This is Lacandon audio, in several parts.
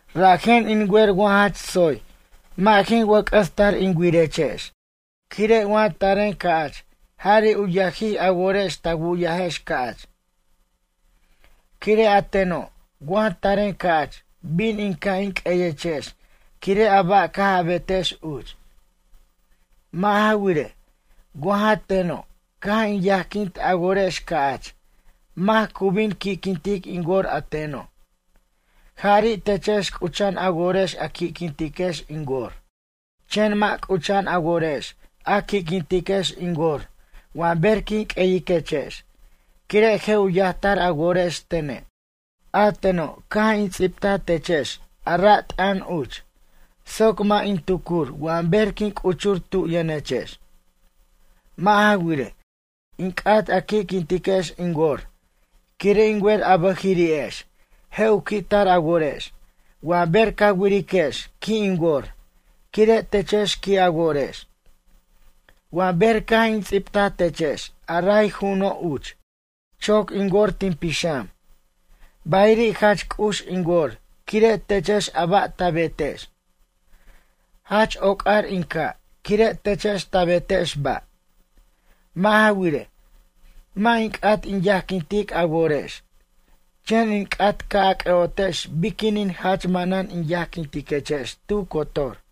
Rajen in wer wa jach tsoy mʌ' jin wʌc'ʌs tar in wirechex, quire' wa taren ca'ch jari' u yajij a worex ta wu'yajex ca'ch. Quire' a teno' wa taren ca'ch bin in ca' in q'ueyechex quire' a ba' caj a betex uch. Mʌ' ja wirej, wa ja teno' caj in yajquint a worex ca'ch mac cu bin u qui'quintic in wor a teno'? Jari' techex c'ucha'an a worex a qui'quintiquex in wor. Chen mʌ' c'ucha'an a worex a qui'quintiquex in wor wa ber quin q'ueyiquechex quire' je' u yajtar a worex tene'. A teno' caj in ts'ibtaj techex a ra' t'ʌn uch soc mʌ' in tucur wa ber quin c'uchur tu yʌnechex. Mʌ' ja wirej, in c'at a qui'quintiquex in wor quire' in wer a bʌjiri'ex je' u qui'tar a worex wa ber ca wiriquex qui' in wor quire' techex qui' a worex. Wa ber caj in ts'ibtaj techex a ray ju'uno' uch, choc in wor tin pixam, bayiri' jach c'ux in wor quire' techex a ba' ta betex. Jach oc'ar in ca' quire' techex ta betex ba'. Mʌ' ja wirej, mʌ' in c'at in yajquintic a worex, chen in c'at ca' a c'ʌ'otex biquinin jach manan in yajquintiquechex tu cotor.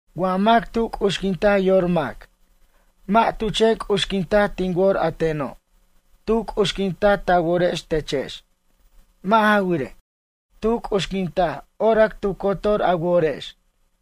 Wa mac tu c'uxquinta yor mac, mʌ' tu chen c'uxquinta tin wor a teno', tu c'uxquinta ta worex techex. Mʌ' ja wirej, tu c'uxquintaj orac tu cotor a worex.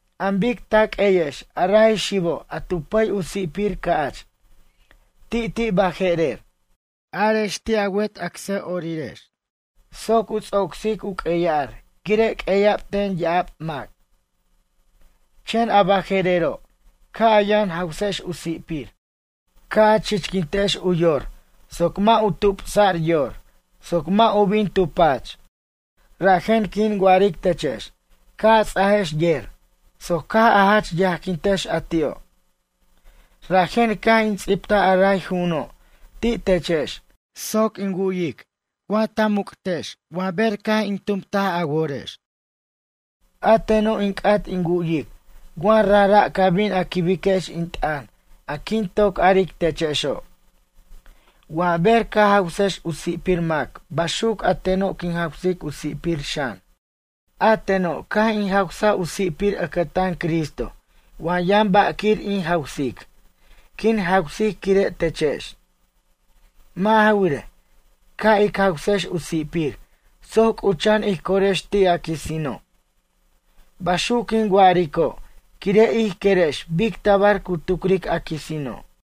An bic ta q'ueyex a ray xibo' a tu pʌy u si'pir ca'ch, ti'ti' baje'rer. Arex ti' a wet acsa'orirex soc u ts'ocsic u q'ueya'r quire' q'ueya'b ten ya'ab mac. Chen a baje'rero' ca' a yʌn jawsex u si'pir, ca' a chichquintex u yor soc mʌ' u tupsa'r yor, soc mʌ' u bin tu pach. Rajen quin wa'aric techex ca' a ts'ajex yer soc caj a jach yajquintex a ti'o'. Rajen caj in ts'ibtaj a ray ju'uno' ti' techex soc in wu'yic wa ta muc'tex wa ber caj in tumt a worex. A teno' in c'at in wu'yic wa rajra' ca bin a quibex in t'ʌn a quin toc aric techexo'. Wa ber ca jawsex u si'pir mac baxuc a teno' quin jawsic u si'pir xan. A teno' caj in jawsaj u si'pir ʌcʌtan Cristo wa yʌn ba' quir in jawsic, quin jawsic quire' techex. Mʌ' ja wirej, ca' ic jawsex u si'pir soc c'ucha'an ij corex ti' a quisino'. Baxuc quin wa'arico' quire' ij querex bic tabar cu tucric a quisino'.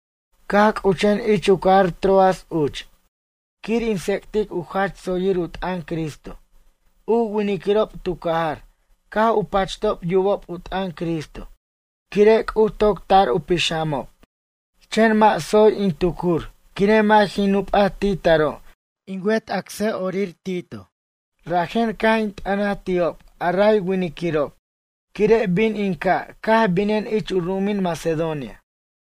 Caj c'uchen ich u cajar Troas uch quir in tsec'tic u jach tsoyir u t'ʌn Cristo, u winiquirob tu cajar caj u pachtob yubob u t'ʌn Cristo quire' C'uj toc tʌr u pixamob. Chen mʌ' tsoy in tucur quire' mʌ' jin nupa ti' taro' in wet acsa'orir Tito. Rajen caj in t'ʌnaj ti'ob a ray winiquirob quire' bin in ca' caj binen ich u ru'umin Macedonia.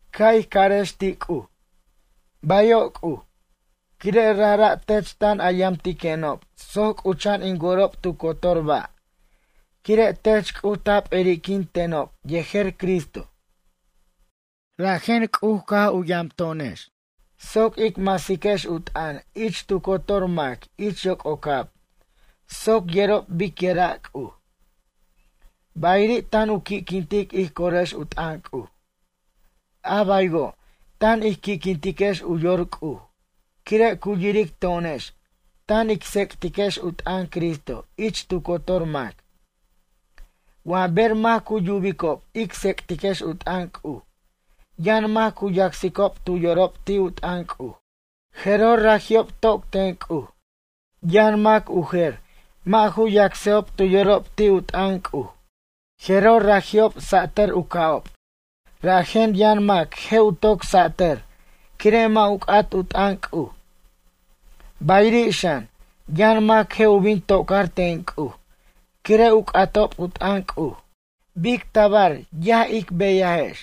Ca' ij carex ti' C'uj: “Bayo' C'uj, quire' rajra' tech tan a yamtiquenob soc c'ucha'an in worob tu cotor ba' quire' tech C'uj ta p'eri'quin tenob yejer Cristo.” Rajen C'uj caj yam to'onex soc ic masiquex u t'ʌn ich tu cotor mac ich yoc'ocab soc yerob biquira' C'uj. Bayiri' tan u qui'quintic ij corex u t'ʌn c'uj. A baywo', tan ij qui'quintiquex u yor C'uj quire' cu yiric to'onex tan ic tsec'tiquex u t'ʌn Cristo ich tu cotor mac. Wa ber mac cu yubicob ic tsec'tiquex u t'ʌn C'uj yʌn mac cu yacsicob tu yorob ti' u t'ʌn C'uj, jeroj raji'ob toc ten C'uj. Yʌn mac u jer mʌ' ju yacsejob tu yorob ti' u t'ʌn C'uj, jeroj raji'ob satʌr u ca'ob. Rajen yʌn mac je' u toc satʌr quire' mʌ' u c'at u t'ʌn C'uj. Bayiri' xan yʌn mac je' u bin tocar ten C'uj quire' u c'atob u t'ʌn C'uj. Ay, bic tabar yaj ic beyajex!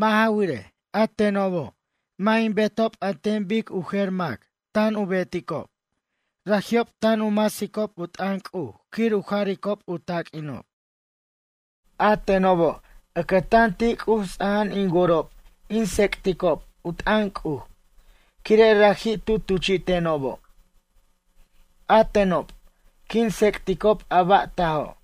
Mʌ' ja wirej, a tenobo' mʌ' in betob an ten bic u jer mac tan u beticob, raji'ob tan u masicob u t'ʌn C'uj quir u jaricob u taq'uinob. A tenobo' ʌcʌtan ti' C'uj ts'aja'an in worob in tsec'ticob u t'ʌn C'uj quire' raji' tu tuchi'tenobo'. A tenob quin tsec'ticob a ba' tajo'.